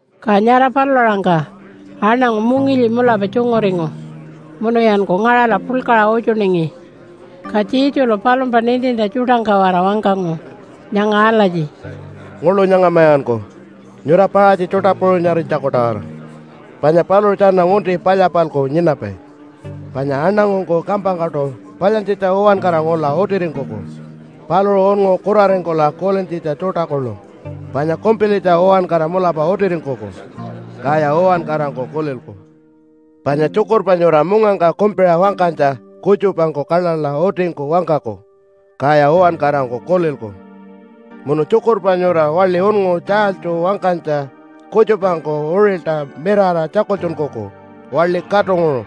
Ka nyara palula-aṟangka aṉangu mungilyi mulapa tjunguringu munuyanku ngaṟala puḻkaṟa utjuningi. Ka Jesulu palumpa nintintja tjuṯangka-waraṟa wangkangu nyanga alatji, “Nguḻu nyangamayanku nyura Paṟatji tjuṯa puṟunyarinytjaku-tawara panya paluṟu tjana ngunti palya-palku nyinapai. Panya aṉangungku kampangkaṯu palyantjitja uwankara ngula utiringkuku, paluṟu unngu kuraringkula kulintjitja tjuṯa kuḻu, panya kumpilitja uwankara mulapa utiringkuku, kaya uwankarangku kulilku. Panya tjukurpa nyura mungangka kumpiṟa wangkanytja kutjupangku kaḻaḻa utingku wangkaku, kaya uwankarangku kulilku. Munu tjukurpa nyura waḻi unngu tjaalytju wangkanytja kutjupangku uṟilta mirara tjakultjunkuku waḻi katunguṟu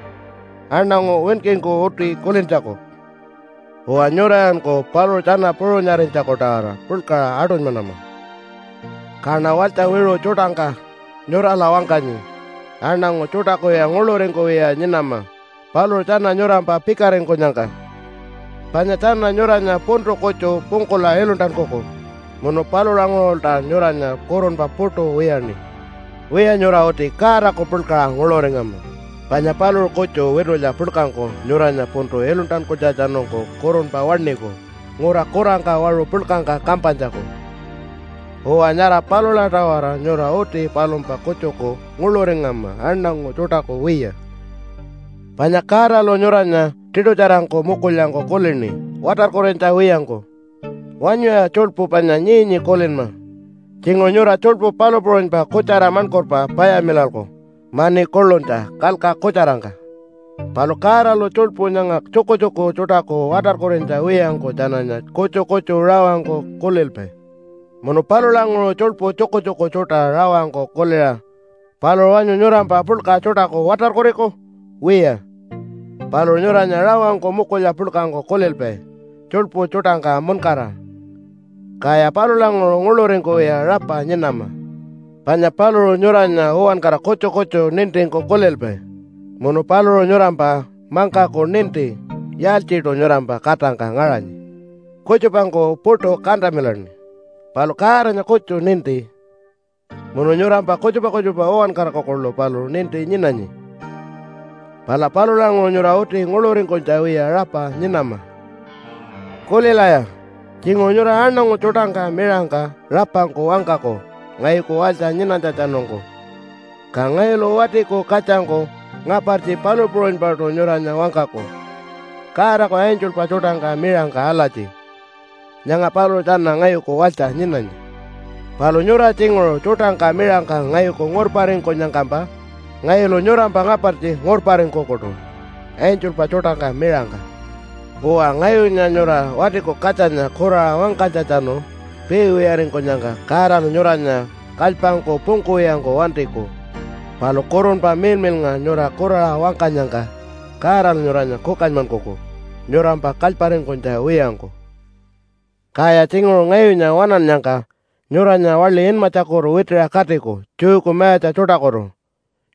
aṉangu winkingku uti kulintjaku. Uwa nyurayanku paluṟu tjana puṟunyarinytjaku-tawara puḻkaṟa aṯunymanama.” “Kaṉa walytja wiṟu tjuṯangka nyurala wangkanyi, aṉangu tjuṯakuya nguḻuringkuwiya nyinama paluṟu tjana nyurampa pikaringkunyangka, panya tjana nyuranya puntu kutju pungkula iluntankuku, munu palulanguṟulta nyuranya kurunpa puṯu wiyaṉi. Wiya, nyura uti Godaku puḻkaṟa nguḻuringama panya paluṟu kutju witulya puḻkangku nyuranya puntu iluntankunytjatjanungku kurunpa waṉiku ngura kurangka waṟu puḻkangka kampanytjaku. Uwa, nyara palula-tawara nyura uti palumpa kutjuku nguḻuringama aṉangu tjuṯaku wiya. “Panya Godalu nyuranya tiṯutjarangku mukulyangku kulini watarkurinytja wiyangku. Wanyuya tjuḻpu panya nyii-nyii kulinma. Tjinguṟu nyura tjuḻpu palu puṟunypa kutjara maṉkurpa payamilalku mani kuḻunytja kalka kutjarangka. Palu Godalu tjuḻpu nyanga tjukutjuku tjuṯaku watarkurinytja wiyangku tjananya kutju kutju rawangku kulilpai. Munu palulanguṟu tjuḻpu tjukutjuku tjuṯa rawangku kuliṟa paluṟu wanyu nyurampa puḻka tjuṯaku watarkuriku? Wiya, paluṟu nyuranya rawangku mukulya puḻkangku kulilpai tjuḻpu tjuṯangka muṉkara, kaya palulanguṟu nguḻuringkuwiya rapa nyinama. Panya paluṟu nyuranya uwankara kutju kutju nintingku kulilpai. Munu paluṟu nyurampa mangkaku ninti yaaltjiṯu nyurampa katangka ngaṟanyi. Kutjupangku puṯu kantamilaṉi, palu Godanya kutju ninti, munu nyurampa kutjupa kutjupa uwankaraku kuḻu paluṟu ninti nyinanyi. Pala palulanguṟu nyura uti nguḻuringkunytja wiya rapa nyinama. “Kulilaya! Tjinguṟu nyura aṉangu tjuṯangka miṟangka rapangku wangkaku ngayuku walytja nyinanytjatjanungku, ka ngayulu Watiku Katjangku ngapartji palu puṟunypaṯu nyuranya wangkaku Godaku angelpa tjuṯangka miṟangka alatji, ‘Nyanga paluṟu tjana ngayuku walytja nyinanyi.’ Palu nyura tjinguṟu tjuṯangka miṟangka ngayuku ngurparingkunyangkampa ngayulu nyurampa ngapartji ngurparingkukuṯu angelpa tjuṯangka miṟangka. Uwa, ngayunya nyura Watiku Katjanya kuraṟa wangkanytjatjanu piiwiyaringkunyangka Godalu nyuranya kalypangku pungkuwiyangku wantiku. Palu Kurunpa Miḻmiḻnga nyura kuraṟa wangkanyangka Godalu nyuranya kukanymankuku nyurampa kalyparingkunytja wiyangku. “Kaya tjinguṟu ngayunya waṉannyangka nyuranya waḻi inmatjakutu witiṟa katiku Jewku mayatja tjuṯakutu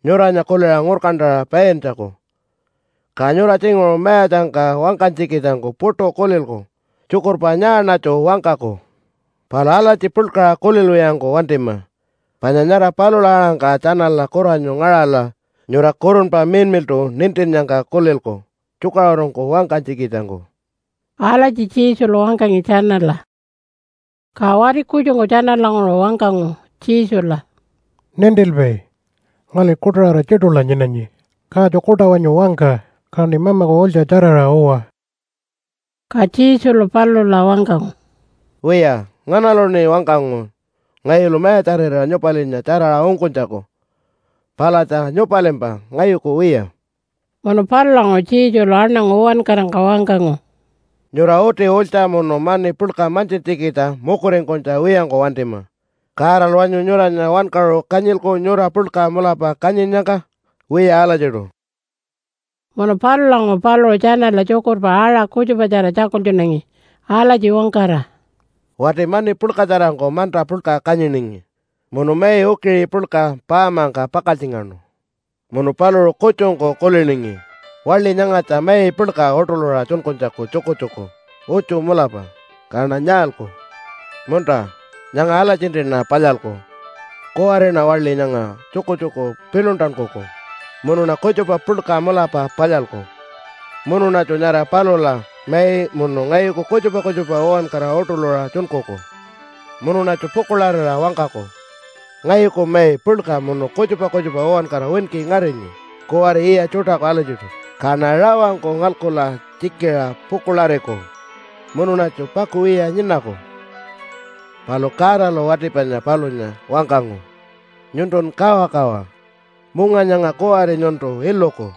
nyuranya kuliṟa ngurkantaṟa paintjaku. Ka nyura tjinguṟu mayatjangka wangkanytjikitjangku puṯu kulilku, ‘Tjukurpa nyaaṉatju wangkaku?’ Palu alatji puḻkaṟa kulilwiyangku wantima, panya nyara palula aṟangka tjanala kuranyu ngaṟala nyura Kurunpa Miḻmiḻṯu nintinnyangka kulilku tjukaṟurungku wangkanytjikitjangku.” Alatji Jesulu wangkangi tjanala. Ka wati kutjungku tjanalanguṟu wangkangu Jesula, “Nintilpai, ngali kuṯaṟara tjiṯula nyinanyi. Katju kuṯa wanyu wangka, kaṉi mamaku ulytja tjaraṟa uwa.” Ka Jesulu palula wangkangu, “Wiya, nganaluṉi wangkangu ngayulu mayatjarira nyupalinya tjaraṟa ungkunytjaku? Palatja nyupalimpa, ngayuku wiya.” Munu palulanguṟu Jesulu aṉangu uwankarangka wangkangu, “Nyura uti ulytja munu mani puḻka mantjintjikitja mukuringkunytja wiyangku wantima! Godalu wanyu nyuranya wankaṟu kanyilku nyura puḻka mulapa kanyinnyangka? Wiya alatjiṯu.” Munu palulanguṟu paluṟu tjanala tjukurpa aṟa kutjupatjara tjakultjunangi alatji wangkara, “Wati mani puḻkatjarangku manta puḻka kanyiningi munu mai ukiṟi puḻka paamangka pakaltjingaṉu. Munu paluṟu kutjungku kuliningi, ‘Waḻi nyangatja mai puḻka uṯuḻuṟa tjunkunytjaku tjukutjuku utju mulapa, kaṉa nyaalku? Munta, nyanga alatjintiṉa palyalku. Kuwariṉa waḻi nyanga tjukutjuku piḻuntankuku munuṉa kutjupa puḻka mulapa palyalku munuṉatju nyara palula mai munu ngayuku kutjupa kutjupa uwankara uṯuḻuṟa tjunkuku. Munuṉatju pukuḻarira wangkaku, “Ngayuku mai puḻka munu kutjupa kutjupa uwankara winki ngarinyi kuwari yiya tjuṯaku alatjiṯu, kaṉa rawangku ngalkula tjikiṟa pukuḻariku munuṉatju pakuwiya nyinaku.” ’ “Palu Godalu wati panya palunya wangkangu, ‘Nyuntun kawakawa! Munga nyanga kuwari nyuntu iluku,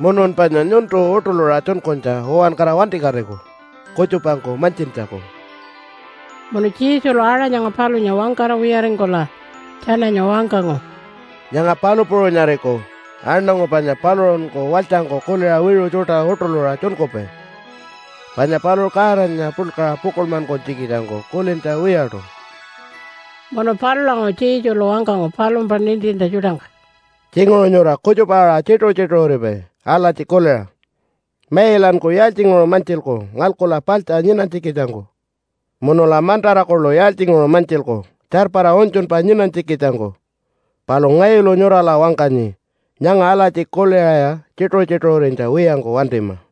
munun panya nyuntu uṯuḻuṟa tjunkunytja uwankara wantikatiku kutjupangku mantjintjaku.’” Munu Jesulu aṟa nyanga palunya wangkara wiyaringkula tjananya wangkangu, “Nyanga palu puṟunyariku aṉangu panya paluṟunku walytjangku kuliṟa wiṟu tjuṯa uṯuḻuṟa tjunkupai, panya paluṟu Godanya puḻkaṟa pukuḻmankunytjikitjangku kulintja wiyaṯu.” Munu palulanguṟu Jesulu wangkangu palumpa nintintja tjuṯangka, “Tjinguṟu nyura kutjupa-aṟa tjituṟu-tjituṟuripai alatji kuliṟa, ‘Mailanku yaaltjinguṟu mantjilku ngalkula paḻtja nyinanytjikitjangku, munula mantara kuḻu yaaltjinguṟu mantjilku tjarpara unytjunpa nyinanytjikitjangku?’ Palu ngayulu nyurala wangkanyi nyanga alatji kuliṟaya tjituṟu-tjituṟurinytja wiyangku wantima!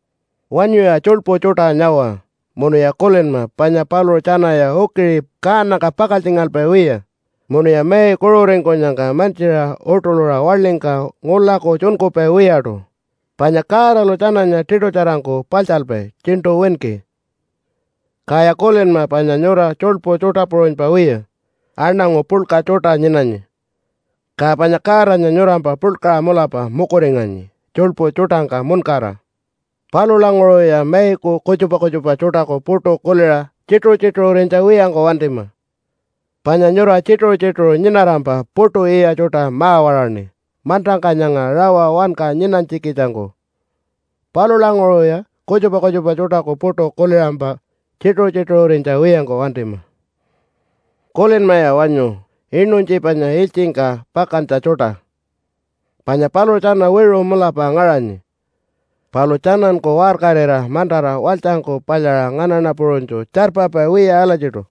“Wanyuya tjuḻpu tjuṯa nyawa munuya kulinma panya paluṟu tjanaya ukiṟi kaanangka pakaltjingalpai wiya munuya mai kuṟuringkunyangka mantjiṟa uṯuḻuṟa waḻingka ngulaku tjunkupai wiyaṯu, panya Godalu tjananya tiṯutjarangku paḻtjalpai tjiṉṯu winki. Kaya kulinma panya nyura tjuḻpu tjuṯa puṟunypa wiya aṉangu puḻka tjuṯa nyinanyi, ka panya Godanya nyurampa puḻkaṟa mulapa mukuringanyi tjuḻpu tjuṯangka muṉkara. Palulanguṟuya maiku kutjupa kutjupa tjuṯaku puṯu kuliṟa tjituṟu-tjituṟurinytja wiyangku wantima, panya nyura tjituṟu-tjituṟu nyinarampa puṯu yiya tjuṯa ma-waṟaṉi mantangka nyanga rawa wanka nyinanytjikitjangku. Palulanguṟuya kutjupa kutjupa tjuṯaku puṯu kuliṟampa tjituṟu-tjituṟurinytja wiyangku wantima. “Kulinmaya wanyu inuntji panya ilytjingka pakantja tjuṯa, panya paluṟu tjana wiṟu mulapa ngaṟanyi, palu tjananku waṟkarira mantara walytjangku palyaṟa nganaṉa puṟunytju tjarpapai wiya alatjiṯu.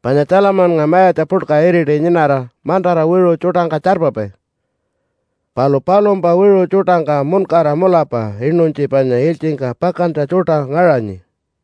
Panya Tjalamannga mayatja puḻka iriti nyinara mantara wiṟu tjuṯangka tjarpapai, palu palumpa wiṟu tjuṯangka muṉkara mulapa inuntji panya ilytjingka pakantja tjuṯa ngaṟanyi.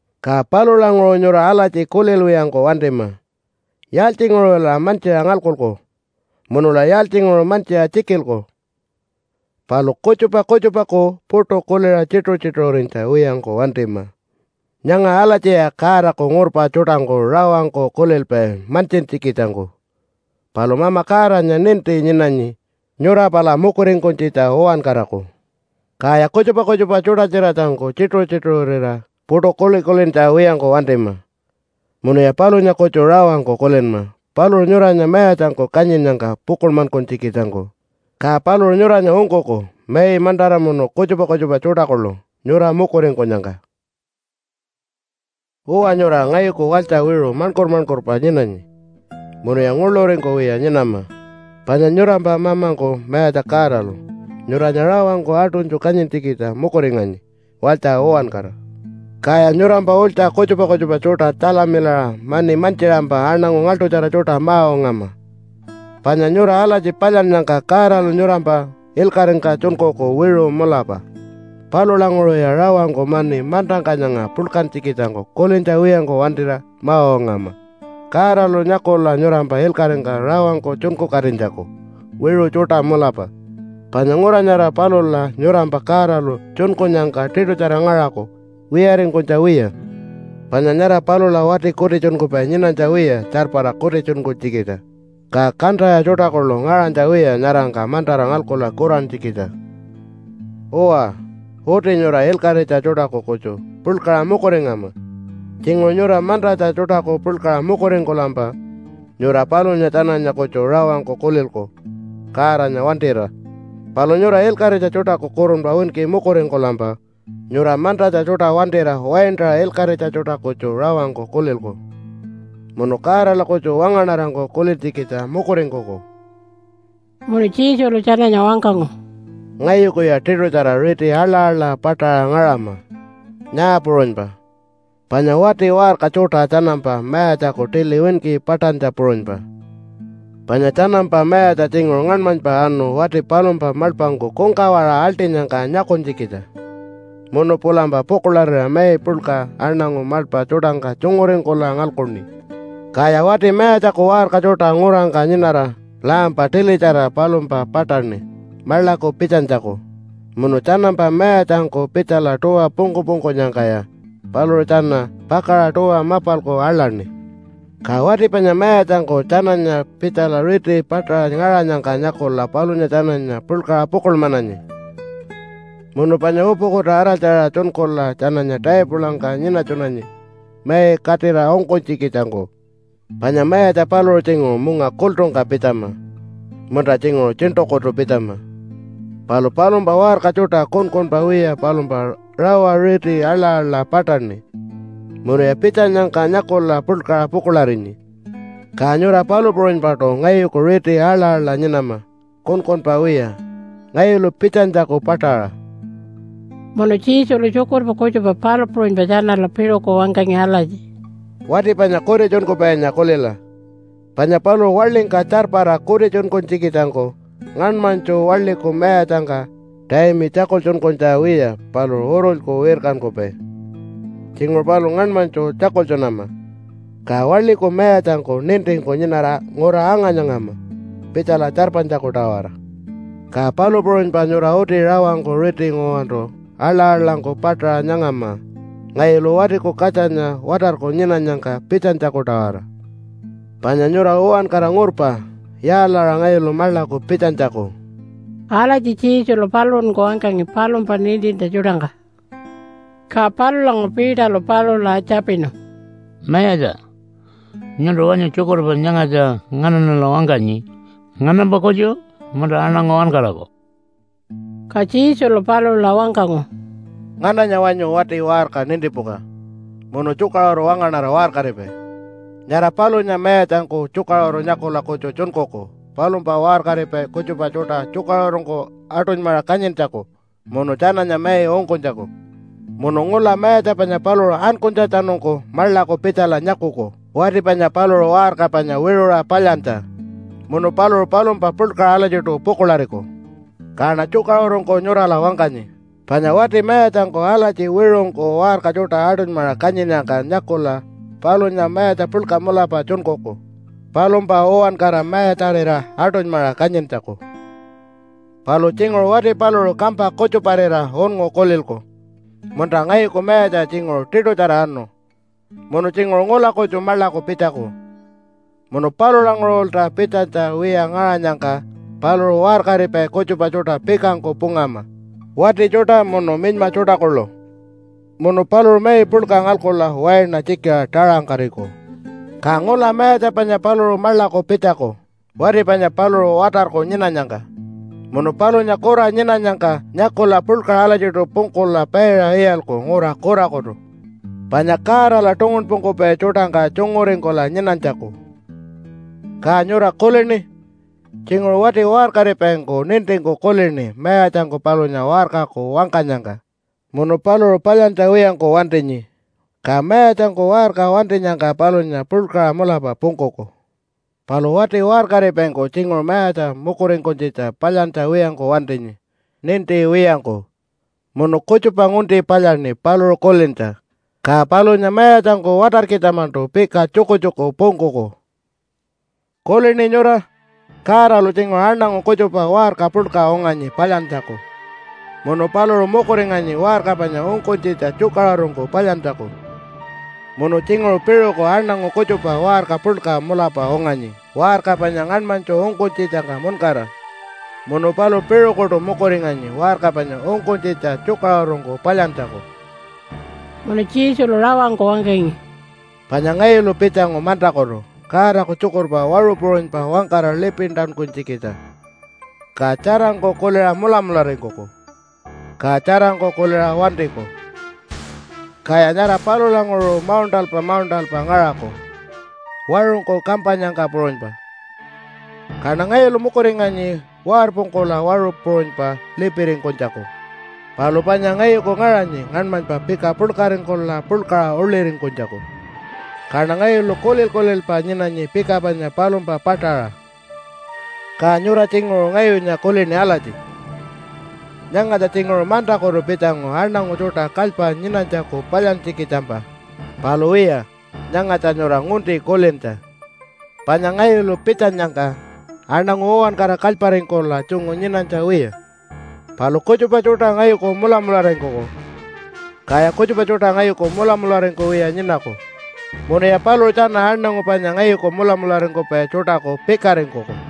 “Ka palulanguṟu nyura alatji kulilwiyangku wantima, ‘Yaaltjinguṟula mantjiṟa ngalkuku? Munula yaaltjinguṟu mantjiṟa tjikilku?’ Palu kutjupa kutjupaku puṯu kuliṟa tjituṟu-tjituṟurinytja wiyangku wantima. Nyanga alatjiya Godaku ngurpa tjuṯangku rawangku kulilpai mantjintjikitjangku. Palu Mama Godanya ninti nyinanyi nyura pala mukuringkunytjitja uwankaraku. Kaya kutjupa kutjupa tjuṯa-tjiratjangku tjituṟu-tjituṟurira puṯu kuli-kulintja wiyangku wantima, munuya palunya kutju rawangku kulinma paluṟu nyuranya mayatjangku kanyinnyangka pukuḻmankunytjikitjangku, ka paluṟu nyuranya ungkuku mai, mantara, munu kutjupa kutjupa tjuṯa kuḻu nyura mukuringkunyangka. “Uwa, nyura ngayuku walytja wiṟu maṉkur-maṉkurpa nyinanyi, munuya nguḻuringkuwiya nyinama. Panya nyurampa mamangku Mayatja Godalu nyuranya rawangku aṯunytju kanyintjikitja mukuringanyi walytja uwankara. Kaya nyurampa ulytja kutjupa kutjupa tjuṯa tjalamilaṟa mani mantjiṟampa aṉangu ngaḻṯutjara tjuṯa ma-ungama. Panya nyura alatji palyannyangka Godalu nyurampa ilkaṟingka tjunkuku wiṟu mulapa. Palulanguṟuya rawangku mani mantangka nyanga puḻkantjikitjangku kulintja wiyangku wantira ma-ungama Godalu nyakula nyurampa ilkaṟingka rawangku tjunkukatinytjaku wiṟu tjuṯa mulapa. Panya ngura nyara palula nyurampa Godalu tjunkunyangka tiṯutjara ngaṟaku wiyaringkunytja wiya. Panya nyara palula wati kutitjunkupai nyinanytja wiya tjarpara kutitjunkunytjikitja, ka kantaya tjuṯa kuḻu ngaṟanytja wiya nyarangka mantara ngalkula kurantjikitja. “Uwa, uti nyura ilkaṟitja tjuṯaku kutju puḻkaṟa mukuringama. Tjinguṟu nyura mantatja tjuṯaku puḻkaṟa mukuringkulampa nyura palunya tjananya kutju rawangku kulilku Godanya wantira. Palu nyura ilkaṟitja tjuṯaku kurunpa winki mukuringkulampa nyura mantatja tjuṯa wantira waintaṟa ilkaṟitja tjuṯa kutju rawangku kulilku munu Godala kutju wangaṉarangku kulintjikitja mukuringkuku.” Munu Jesulu tjananya wangkangu, “Ngayukuya tiṯutjara riti aḻa-aḻa paṯaṟa ngaṟama, nyaa puṟunypa, panya wati waṟka tjuṯa tjanampa mayatjaku tili winki paṯantja puṟunypa. Panya tjanampa mayatja tjinguṟu ngaṉmanypa anu wati palumpa maḻpangku kungkawaṟa aḻṯinyangka nyakunytjikitja munu pulampa pukuḻarira mai puḻka aṉangu maḻpa tjuṯangka tjunguringkula ngalkuṉi. Kaya wati mayatjaku waṟka tjuṯa ngurangka nyinara lampa tilitjara palumpa paṯaṉi maḻaku pitjanytjaku. Munu tjanampa mayatjangku pitjala tuwa pungku-pungkunyangkaya paluṟu tjana pakaṟa tuwa mapalku aḻaṉi. Ka wati panya mayatjangku tjananya pitjala riti paṯaṟa ngaṟanyangka nyakula palunya tjananya puḻkaṟa pukuḻmananyi, munu panya upukuta araltjaṟa tjunkula tjananya taipulangka nyinatjunanyi mai katira ungkunytjikitjangku. Panya mayatja paluṟu tjinguṟu munga kultungka pitjama munta tjinguṟu tjiṉṯukutu pitjama, palu palumpa waṟka tjuṯa kunkunpa wiya palumpa rawa riti aḻa-aḻa paṯaṉi munuya pitjanyangka nyakula puḻkaṟa pukuḻarinyi. Ka nyura palu puṟunypaṯu ngayuku riti aḻa-aḻa nyinama kunkunpa wiya ngayulu pitjanytjaku paṯaṟa.” Munu Jesulu tjukurpa kutjupa palu puṟunypa tjanala piṟuku wangkangi alatji, “Wati panya kutitjunkupainya kulila, panya paluṟu waḻingka tjarpara kutitjunkunytjikitjangku ngaṉmanytju waḻiku mayatjangka taimi tjakultjunkunytja wiya paluṟu urulyku wirkankupai. Tjinguṟu paluṟu ngaṉmanytju tjakultjunama, ka waḻiku mayatjangku nintingku nyinara ngura anga-nyangama pitjala tjarpanytjaku-tawara. Ka palu puṟunypa nyura uti rawangku riti nguwantu aḻa-aḻangku paṯaṟa nyangama ngayulu Watiku Katjanya watarku nyinanyangka pitjanytjaku-tawara. Panya nyura uwankara ngurpa yaalaṟa ngayulu maḻaku pitjanytjaku.” Alatji Jesulu paluṟunku wangkangi palumpa nintintja tjuṯangka. Ka palulanguṟu Peterlu palula tjapinu, “Mayatja, nyuntu wanyu tjukurpa nyangatja nganaṉala wangkanyi nganampa kutju, munta aṉangu uwankaraku?” Ka Jesulu palula wangkangu, “Ngananya wanyu wati waṟka nintipuka munu tjukaṟuru wangaṉara waṟkaripai? Nyara palunya mayatjangku tjukaṟuru nyakula kutju tjunkuku palumpa waṟkaripai kutjupa tjuṯa tjukaṟurungku aṯunymaṟa kanyintjaku munu tjananya mai ungkunytjaku. Munu ngula mayatja panya paluṟu ankunytjatjanungku maḻaku pitjala nyakuku wati panya paluṟu waṟka panya wiṟuṟa palyantja. Munu paluṟu palumpa puḻkaṟa alatjiṯu pukuḻariku. Kaṉa tjukaṟurungku nyurala wangkanyi, panya wati mayatjangku alatji wiṟungku waṟka tjuṯa aṯunymaṟa kanyinnyangka nyakula palunya mayatja puḻka mulapa tjunkuku palumpa uwankara mayatjarira aṯunymaṟa kanyintjaku. “Palu tjinguṟu wati paluṟu kampa kutjuparira unngu kulilku, ‘Munta ngayuku mayatja tjinguṟu tiṯutjara anu munu tjinguṟu ngula kutju maḻaku pitjaku.’ Munu palulanguṟulta pitjanytja wiya ngaṟanyangka paluṟu waṟkaripai kutjupa tjuṯa pikangku pungama, wati tjuṯa munu minyma tjuṯa kuḻu. Munu paluṟu mai puḻka ngalkula waina tjikiṟa taṟangkariku. Ka ngula mayatja panya paluṟu maḻaku pitjaku wati panya paluṟu watarku nyinanyangka. Munu palunya kura nyinanyangka nyakula puḻkaṟa alatjiṯu pungkula paiṟa iyalku ngura kurakutu panya Godala tungunpungkupai tjuṯangka tjunguringkula nyinanytjaku. “Ka nyura kulini? Tjinguṟu wati waṟkaripaingku nintingku kulini mayatjangku palunya waṟkaku wangkanyangka munu paluṟu palyantja wiyangku wantinyi. Ka mayatjangku waṟka wantinyangka palunya puḻkaṟa mulapa pungkuku. Palu wati waṟkaripaingku tjinguṟu mayatja mukuringkunytjitja palyantja wiyangku wantinyi ninti wiyangku munu kutjupa ngunti palyaṉi paluṟu kulintja. Ka palunya mayatjangku watarkitja-maṉṯu pika tjukutjuku pungkuku. “Kulini nyura? Godalu tjinguṟu aṉangu kutjupa waṟka puḻka unganyi palyantjaku, munu paluṟu mukuringanyi waṟka panya ungkunytjitja tjukaṟurungku palyantjaku. Munu tjinguṟu piṟuku aṉangu kutjupa waṟka puḻka mulapa unganyi waṟka panya ngaṉmanytju ungkunytjitjangka muṉkara, munu paluṟu piṟukuṯu mukuringanyi waṟka panya ungkunytjitja tjukaṟurungku palyantjaku.” Munu Jesulu rawangku wangkangi, “Panya ngayulu pitjangu mantakutu Godaku tjukurpa waṟu puṟunypa wangkara lipintankunytjikitja. Ka tjarangku kuliṟa mulamularingkuku, ka tjarangku kuliṟa wantiku. Kaya nyara palulanguṟu mauṉṯalpa mauṉṯalpa ngaṟaku waṟungku kampanyangka puṟunypa. Kaṉa ngayulu mukuringanyi warpungkula waṟu puṟunypa lipiringkunytjaku. Palu panya ngayuku ngaṟanyi ngaṉmanypa pika puḻkaringkula puḻkaṟa uḻiringkunytjaku, kaṉa ngayulu kulil-kulilpa nyinanyi pika panya palumpa paṯaṟa. “Ka nyura tjinguṟu ngayunya kulini alatji, ‘Nyangatja tjinguṟu mantakutu pitjangu aṉangu tjuṯa kalypa nyinanytjaku palyantjikitjampa.’ Palu wiya, nyangatja nyura ngunti kulintja, panya ngayulu pitjanyangka aṉangu uwankara kalyparingkula tjungu nyinanytja wiya, palu kutjupa tjuṯa ngayuku mulamularingkuku, kaya kutjupa tjuṯa ngayuku mulamularingkuwiya nyinaku munuya paluṟu tjana aṉangu panya ngayuku mulamularingkupai tjuṯaku pikaringkuku.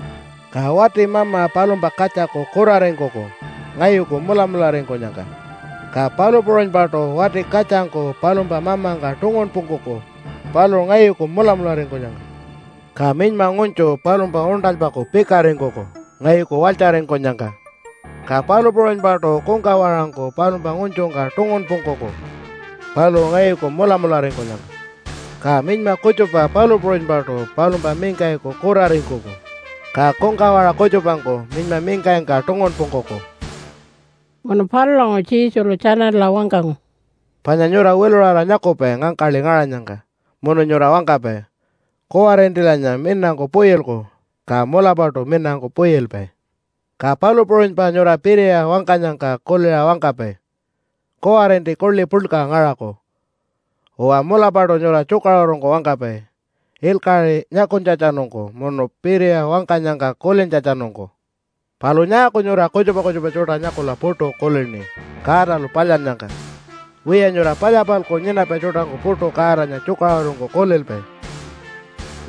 “Ka wati mama palumpa katjaku kuraringkuku ngayuku mulamularingkunyangka. Ka palu puṟunypaṯu wati katjangku palumpa mamangka tungunpungkuku paluṟu ngayuku mulamularingkunyangka. Ka minyma ngunytju palumpa uṉṯalpaku pikaringkuku ngayuku walytjaringkunyangka. Ka palu puṟunypaṯu kungkawaṟangku palumpa ngunytjungka tungunpungkuku paluṟu ngayuku mulamularingkunyangka. Ka minyma kutjupa palu puṟunypaṯu palumpa mingkayiku kuraringkuku, ka kungkawaṟa kutjupangku minyma mingkayingka tungunpungkuku.” Munu palulanguṟu Jesulu tjanala wangkangu, “Panya nyura wiluṟara nyakupai ngangkaḻi ngaṟanyangka munu nyura wangkapai, ‘Kuwarintilanya minangku puyilku.’ Ka mulapaṯu minangku puyilpai. Ka palu puṟunypa nyura piriya wangkanyangka kuliṟa wangkapai, ‘Kuwarinti kuḻi puḻka ngaṟaku.’ Uwa, mulapaṯu nyura tjukaṟurungku wangkapai ilkaṟi nyakunytjatjanungku munu piriya wangkanyangka kulintjatjanungku. Palu nyaaku nyura kutjupa kutjupa tjuṯa nyakula puṯu kulini Godalu palyannyangka? Wiya, nyura palya-palku nyinapai tjuṯangku puṯu Godanya tjukaṟurungku kulilpai.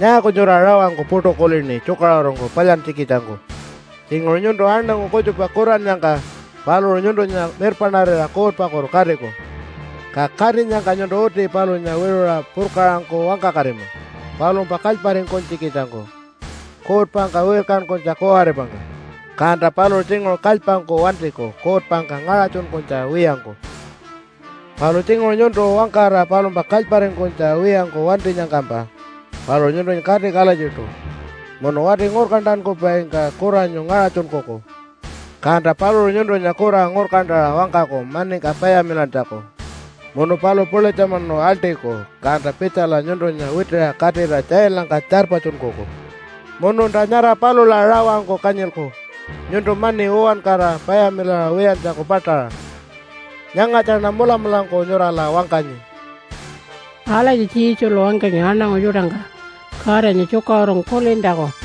“Nyaaku nyura rawangku puṯu kulini tjukaṟurungku palyantjikitjangku? Tjinguṟu nyuntu aṉangu kutjupa kurannyangka paluṟu nyuntunya mirpaṉarira kuutpakutu katiku. Ka katinyangka nyuntu uti palunya wiṟuṟa purkaṟangku wangkakatima palumpa kalyparingkunytjikitjangku kuutpangka wirkankunytja kuwaripangka, kanta paluṟu tjinguṟu kalypangku wantiku kuutpangka ngaṟatjunkunytja wiyangku. “Palu tjinguṟu nyuntu wangkara palumpa kalyparingkunytja wiyangku wantinyangkampa paluṟu nyuntunya katiku alatjiṯu munu wati ngurkantankupaingka kuranyu ngaṟatjunkuku, kanta paluṟu nyuntunya kura ngurkantaṟa wangkaku maningka payamilantjaku munu paluṟu pulitjamunu aḻṯiku kanta pitjala nyuntunya witiṟa katira tjailangka tjarpatjunkuku. Mununta nyara palula rawangku kanyilku nyuntu mani uwankara payamilaṟa wiyantjaku paṯaṟa. Nyangatjaṉa mulamulangku nyurala wangkanyi.” Alatji Jesulu wangkangi aṉangu tjuṯangka Godanya tjukaṟurungku kulintjaku.